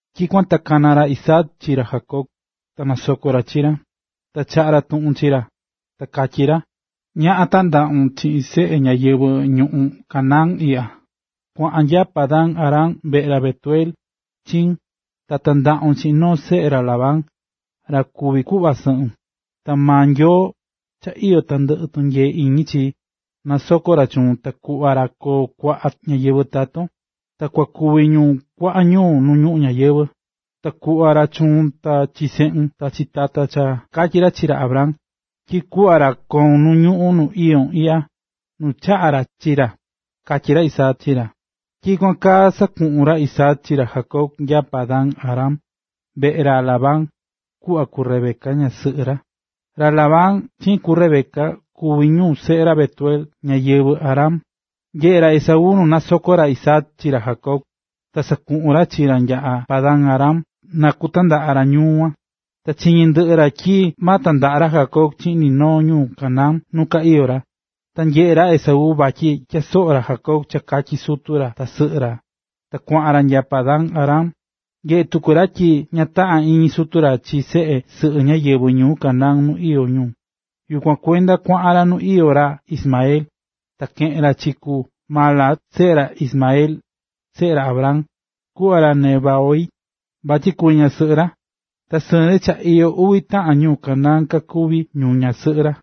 Tyikuan ta kana̱ ra Isaac chi ra Jacob, ta nasoko̱ ra chi ra, ta chaꞌa̱ ra tuꞌun chi ra, ta katyí ra: “Ñaꞌa tandaꞌun chiꞌin seꞌe ñáyɨvɨ ñuꞌún Canaán iꞌya. Kua̱ꞌan nya Padan-aram veꞌe ra Betuel, chiun, ta tandaꞌun chiꞌin noo seꞌe ra Labán, ra kuví kuꞌva sɨꞌun. Ta maa Nyoo, cha iyó tandɨꞌɨ tunyee iñi chi, na nasoko ra chuun ta kuꞌva ra koo kuaꞌa ñáyɨvɨ taton, ta kua kuvi ñu kuaꞌa ñuu nu ñuꞌún ñáyɨvɨ. Ta kuꞌva ra chuun ta chi seꞌun ta chi taton cha katyi̱ ra chi ra Abraham, tyi kuꞌva ra koon nu ñuꞌún nu iyón iꞌya, nu chaꞌa̱ ra chi ra”, katyí ra Isaac chi ra. Tyikuan kaa sakuꞌu̱n ra Isaac chi ra Jacob nya Padan-aram, veꞌe ra Labán, kuꞌva ku Rebeca, ñasɨꞌɨ ra. Ra Labán chiꞌin ku Rebeca kuvi ñu seꞌe ra Betuel, ñáyɨvɨ Aram. Nyeꞌe̱ ra Esaú nu nasoko̱ ra Isaac chi ra Jacob, ta sakuꞌu̱n ra chi ra nya Padan-aram na kutandaꞌa ra ñuu kuan. Ta chiñi̱ ndɨꞌɨ ra tyi ma tandaꞌa ra Jacob chiꞌin ni noo ñu Canaán nu ka iyó ra. Ta nyeꞌe̱ ra Esaú vatyi tyasoꞌo̱ ra Jacob cha katyí sutu ra ta sɨꞌɨ ra, ta kuaꞌan ra nya Padan-aram. Nyeꞌe̱ tuku ra tyi ña taꞌán iñi sutu ra chi seꞌe sɨꞌɨ ñáyɨvɨ ñuu Canaán nu iyó ñu; yukuan kuenda kuaꞌan ra nu iyó ra Ismael. Ta keꞌe̱n ra chi ku Mahalat, seꞌe ra Ismael, seꞌe ra Abraham, kuꞌva ra Nebaiot, vatyi kuvi ñasɨꞌɨ ra. Ta sɨɨn ri cha iyó uvi taꞌan ñu Canaán kakuví ñu ñasɨꞌɨ ra.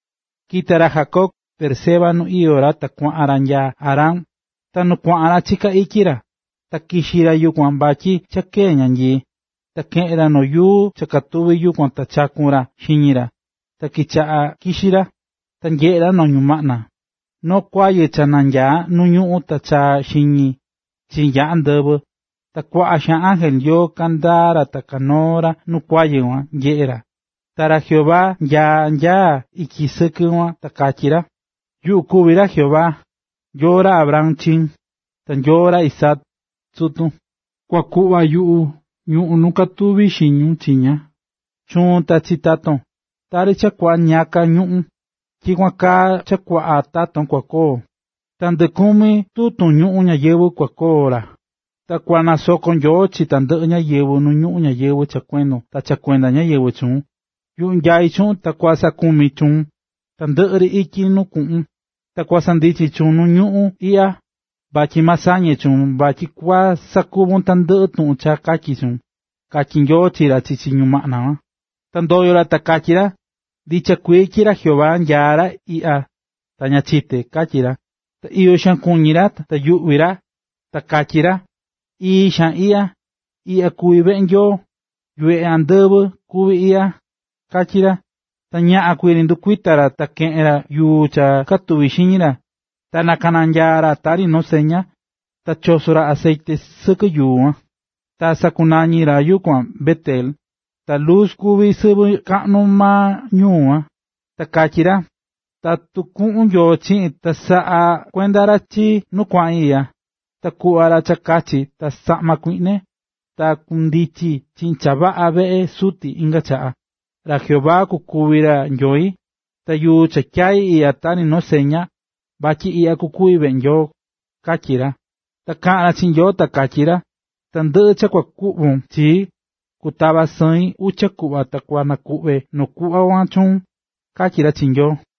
Kita̱ ra Jacob Beerseba nu iyó ra ta kuaꞌan ra nya Harán Ta nu kuaꞌan ra chiká ityi ra, ta kixi̱ ra yukuan vatyi cha kee̱ ñanyii. Ta keꞌe̱n ra noo yuu cha katuvi̱ yukuan ta chaku̱n ra xiñi ra, ta kichaꞌa̱ kixí ra. Ta nyeꞌe̱ ra noo ñumaꞌna: Noo kuayɨ cha nanyaá nu ñuꞌún, ta chaá xiñi chi nya andɨvɨ, ta kuaꞌa xaan ángel Nyoo kandaá ra ta kanoó ra nu kuayɨ kuan, nyeꞌé ra. Ta ra Jehová nyaá nya ityi sɨkɨ kuan ta katyí ra: “Yuꞌu kuví ra Jehová, Nyoo ra Abraham, chiun, ta Nyoo ra Isaac, sutun. Kua kuꞌva yuꞌu ñuꞌún nu katuvún kixún chiña, chuun ta chi taton. Tari cha kuaꞌa ñiyaka ñuꞌún, tyikuan kaa cha kuaꞌa taton kua koo, ta ndɨkumi tutun ñuꞌún ñayɨvɨ̱ kua koo ra, ta kua nasoko Nyoo chi tandɨꞌɨ ñáyɨvɨ nu ñuꞌún ñáyɨvɨ cha kuendon ta cha kuenda ñáyɨvɨ chuun. Yuꞌu nyaí chuꞌun ta kusaꞌakumi chuun tandɨꞌɨ ri ityi nu kuꞌun, ta kusanandichi chuun nu ñuꞌún iꞌya, vatyi ma sañe chuun vatyi kua sakuvi tandɨꞌɨ tuꞌun cha katyí chuun”, katyí Nyoo chi ra chichi ñumaꞌna kuan. Ta ndoyo̱ ra ta katyí ra: “Ndicha kuii tyi ra Jehová nyaá ra iꞌya ta ña chité”, katyí ra. Ta iyo xaan kuñí ta nayuꞌvi̱ ra ta katyí ra: “Ii xaan iꞌya, ta iꞌya kuví veꞌe Nyoo, yuveꞌe andɨvɨ kuví iꞌya”, katyí ra. Ta ñaꞌan kuii ri ndukuita̱ ra, ta keꞌe̱n ra yuu cha katuvi̱ xiñi ra, ta nakananyaa̱ ra tari noo seña, ta choso̱ ra acetye sɨkɨ yuu kuan. Ta sakunañi̱ ra yukuan Bet-ela, ta Luz kuvi̱ sɨvɨ chaꞌnu maa ñuu kuan. Ta katyí ra: “Tatu kuꞌun Nyoo chiꞌin ta saꞌakuenda ra chii nu kuaꞌin iꞌya, ta kuꞌva ra cha kachi ta saꞌma kuiꞌne, ta kundichi chiꞌin cha vaꞌa veꞌe suti inga chaꞌa, ra Jehová kukuvi ra Nyoi. Ta yuu cha tyai̱ iꞌya tari noo seña, vatyi iꞌya kua kuvi veꞌe Nyoo”, katyí ra. Ta kaꞌa̱n ra chiꞌin Nyoo ta katyí ra: “Tandɨꞌɨ cha kua kuꞌvon chii, kutava̱ sɨin uchi kuꞌva ta kua nakuꞌve noo kuꞌva kuan chuun”, katyí ra chi Nyoo.